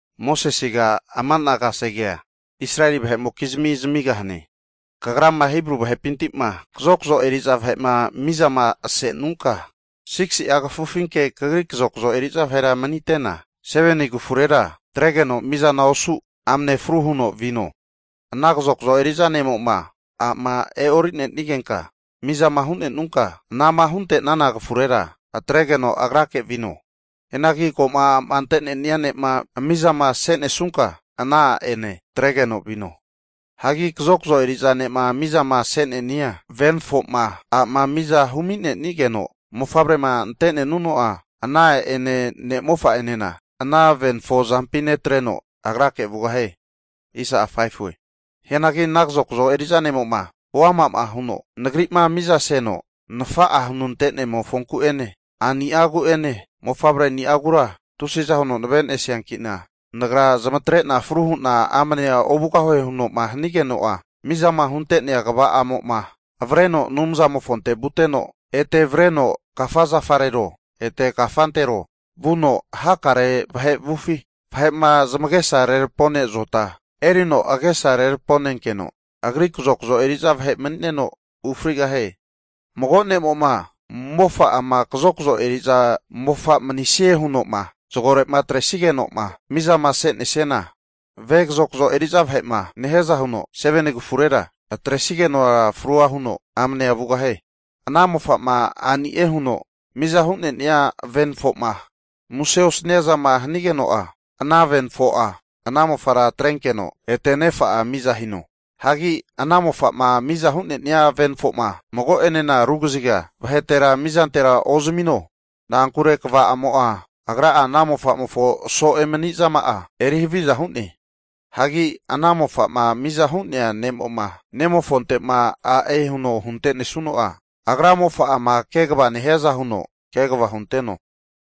Mosesega ama'na kasegea Israeli vahe'mokizmi zamigahane. Kagrama Hibru vahepinti'ma kazokzo eri'za vahe'ma mizama asenunka, 6si'a kafufinke kagri kazokazo eri'za vahera manite'na, 7ni kafurera atregeno mizana osu amne fru huno vino. Ana kazokzo eri'za ne'mo'ma a'ma e'orinenigenka mizama hu'nenunka, anama hunte'nana kafurera atregeno agrake vino. Hianagi ko'ma a'ma ante'nenia ne'ma mizama se'nesunka, ana a'ene atregeno vino. Hagi kazokzo eri'za ne'ma mizama se'ne'nia venafo'ma a'ma miza humi'nenigeno mofavrema ante'nenuno'a, ana a'ane ne'mofa'anena ana venafo azampi netreno, agrake vugahie. Hianagi ana kazokzo eri'za ne'mo'ma huama'ma huno, nagri'ma mizaseno nafa'a hunante'nemofonku'ene a'ni'agu'ene mofavreni'agura tusiza huno navenesiankina nagra zamatre'na fru hu'na amne ovugahue huno'ma hanigeno'a, mizama hunte'nea kva'amo'ma avreno Anumzamofonte vuteno, ete avreno kafa zafarero ete kafantero vuno hakare vahe avufi vahe'ma zamagesa rerapone zota erino agesa reraponenkeno agri kazokzo eri'za vahe mani'neno ufrigahie. Mago ne'mo'ma, mofa'ama kazokazo eri'za mofa manisie huno'ma zagore'ma atresige'noma mizamasesiana, ve kazozko eri'za vahe'ma nehiaza huno, 7ni kafurera atresigenora frua huno amnea ovugahie. Ana mofa'ma a'nie huno miza hu'ne'nia venafo'ma muse osania zama hanigeno'a, ana venafo'a ana mofara atrenkeno ete nefa'a miza hino. Hagi ana mofa'ma miza hu'nenia venafo'ma mago'enena ru kaziga vahetera mizantera ozmino, na'ankure, kva'amo'a agra'a ana mofa'mofo so'e manizama'a eri haviza hu'ne. Hagi ana mofa'ma miza hu'nea ne'mo'ma, ne'mofonte'ma a'e huno huntenesuno'a, agra mofa'ama kegava nehiaza huno kegava hunteno.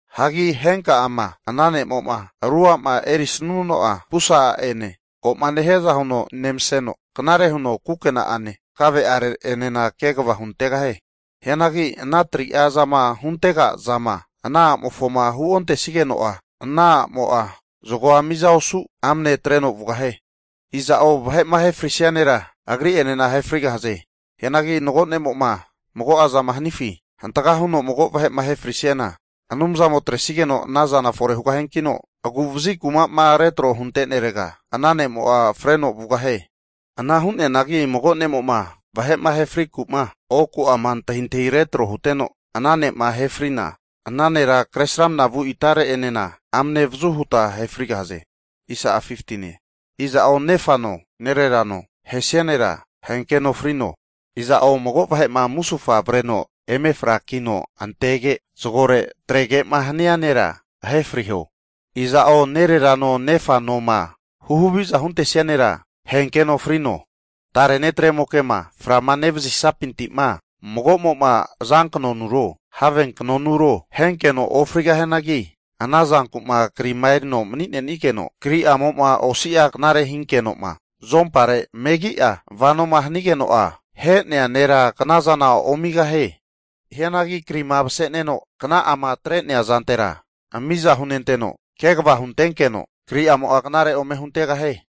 Hagi henka'ama, ana ne'mo'ma ru a'ma erisnuno'a, pusa a'enena ko'ma nehiaza huno nemaseno, knare huno kukena'ane kave'are'enena kegava huntegahie. Hagi ana 3'a zama huntega'zama, ana a'mofoma huontesigeno'a, ana a'mo'a zagoa miza osu amne atreno vugahie. Iza'o vahe'ma ahe frisia nera, agri'enena ahe frigahaze. Hianagi mago ne'mo'ma mago'azama hanifi hantaga huno mago vahe'ma ahe frisiana, Anumzamo atresigeno ana zana fore hugahiankino, agu'vazi kuma'ma retro'ma huntenerega ana ne'mo'a freno vugahie. Ana hu'neanagi mago ne'mo'ma vahe'ma ahe friku'ma, oku'ama antahintahi retro huteno, ana ne'ma ahe frina, ana nera Kresramana vu itareti'enena amne avazu huta ahe frigahaze. Iza'o nefano nererano ahesia nera, ahenkeno frino. Iza'o mago vahe'ma musufa avreno eme frakino antege, zagore atrege'ma hania nera ahe friho. Iza'o nererano nefanoma huhaviza huntesia nera ahenkeno frino. Tare netremoke'ma fra nevazisapinti'ma, mago'mo'ma azanknonuro have knonuro ahenkeno ofrigahianagi, ana zanku'ma krima erino'ma mani'nenigeno, kri'amo'ma osi'a knare hinkeno'ma azompare megi'a vanoma hanigeno'a, ahe'nea nera kanazana omigahie. Hianagi krima maseneno kna'ama atre'nea zantera miza hunenteno kegava hunentenkeno kriamo'a knare ome huntegahie.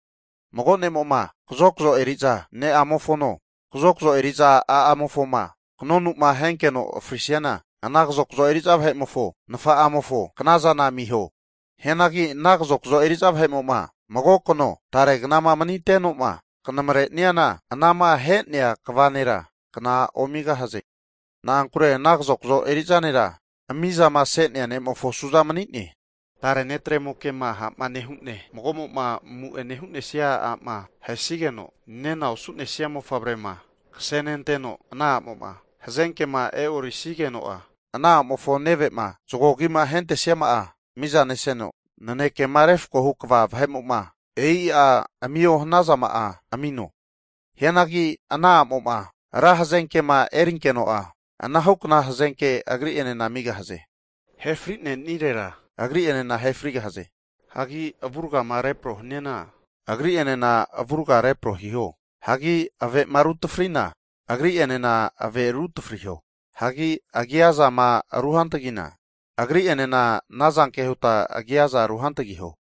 Mago ne'mo'ma kazokzo eri'za ne'amofono, kazokzo eri'za a'amofoma kanonu'ma ahenkeno frisiana, ana kazokzo eriza vahe'mofo nafa'amofo kanazana amiho. Hianagi ana kazokazo eri'za vahe'mo'ma mago kano, tare kanama manite'no'ma knamare'niana, anama ahe'nea kva nera kna omigahaze. Na'ankure ana kazokzo eri'za nera mizamase'nea ne'mofo su'za mani'ne. Tare netremoke'ma ha' nehu'ne mago'ma amu'ene hu'nesnia a'ma ahesigeno nena osu'nesia mofavrema kasenenteno, ana a'mo'ma hazenke'ma e'orisigeno'a, ana a'mofo neve'ma zago agima ahentesiama'a miza neseno nanekema refkohu kva vahe'mo'ma e'i'a amio hanazama'a amino. Hianagi ana a'mo'ma ra hazenke'ma erinkeno'a, anahukna hazenke agri'enena amigahaze. Ahe fri'nirera, agri'enena ahe frigahaze. Hagi avurgama repro haniana, agri'enena avurga repro hiho. Hagi ave'ma ru tafrina, agri'enena ave ru tafriho, hagi agia azama ruhantgina, agri'enena anazanke huta agiaza ruhantgiho.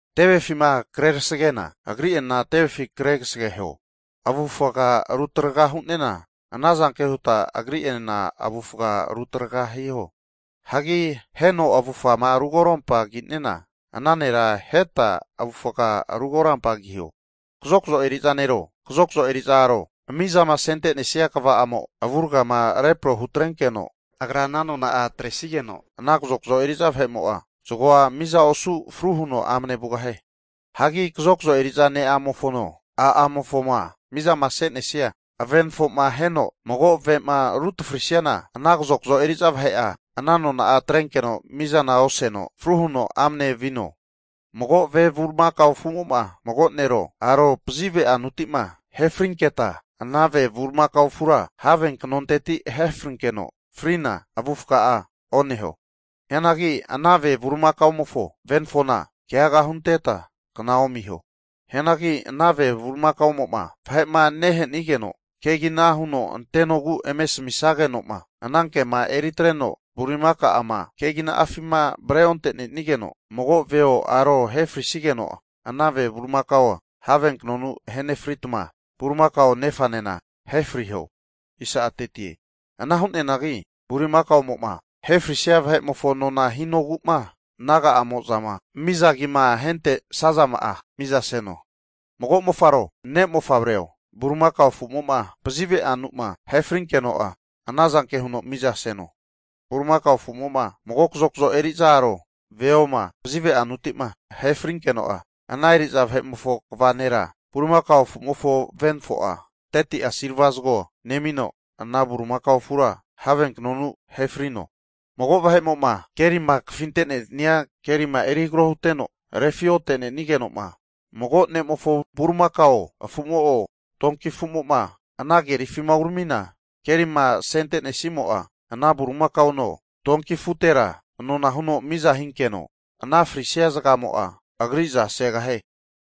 Tevefima kre kasage'na, agri'enena tevefi kre kasageho, avufga rutraga hu'nena, ana zanke huta agri'enena avufga rutraga hiho. Hagi aheno avufgama ru korampamagi'nena, ana nera aheta avufga ru korampagiho. Kazokzo eri'za nero, kazokzo eri'za aro mizama sentenesia kva'amo avurgama repro hutrenkeno'a, agra ana nona'a atresigeno ana kazokzo eri'za vahe'mo'a zagoa miza osu fru huno amne vugahie. Hagi kazokzo eri'za ne'amofono, a'amofoma mizama se'nesia venafo'ma aheno mago ave'ma ru tafrisiana, ana kazokzo eri'za vahe'a ana nona'a atrenkeno mizana oseno fru huno amne vino. Mago ve bulimakao afu'mo'ma mago nero, aro pazive anuti'ma ahe frinketa, ana ve bulimakao afura have knonteti ahefrinkeno frina avufaga'a oneho. Hianagi ana ve bulimakamofo venafona keaga hunteta kna omiho. Hianagi ana ve bulimakamo'ma vahe'ma nehe'nigenoma kegina huno antenogu eme asamisage'noma, ana kema eritreno bulimaka'ama keginafima avre onte'nenigeno mago veo aro ahefrisigeno'a, ana ve bulimakao'a havenkanonu ahenefritma, bulimakao nefanena ahefriho. Ana hugahianagi bulimakaomo'ma ahefrinesia vahe'mofo nona hinogu'ma naga'amozama miza agima ahentesazama'a mizaseno. Mago mofaro, ne'mofavreo, bulimakao afu'mo'ma pazive'anuma ahe frinkeno'a anazanke huno mizaseno. Bulimakao afu'mo'ma mago kazokazo eri'za aro veoma pazive'anuti'ma ahe frinkeno'a, ana eri'za vahe'mofo kva nera bulimakaomofo venafo'a 30'a silva zago nemino, ana bulimakao afura have knonu ahe frino. Mago' vahe'mo'ma keri kafinenteno'o kafinte'nesia kerima eri hagaro huteno refi otenenige'noma mago' ne'mofo bulimakao afumo'o donki afumo'ma ana kerifima uramina, kerima asente'nesnimo'a ana bulimakaono, tonki afutera nona huno miza hinkeno, anama frisia zagamo'a agriza segahie.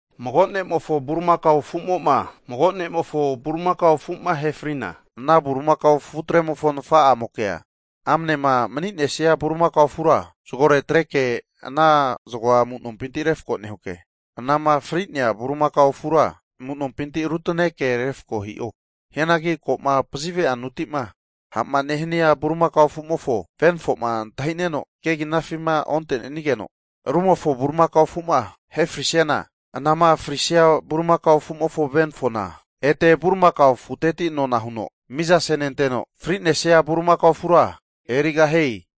Mago ne'mofo bulimakao afumo'ma, mago ne'mofo bulimakao afu'ma ahefrina, ana bulimakao afutremofo nafa'amokea amnema manisia bulimakao afura zagore atreke ana zagoa amu'nompinti refako nehuke, anama fri'nea bulimakao afura amu'nompinti arutaneke refako hi'o. Hianagi ko'ma pazive'anuti'ma ha'ma nehania bulimakao afumofo venafo'ma antahi'neno keginafima onte'nenigeno, rumofo bulimakao afu'ma ahefrisiana, anama frisia bulimakao afu'mofo venafo'na ete bulimakao afuteti nona huno miza senenteno fri'nesia bulimakao afura erigahie.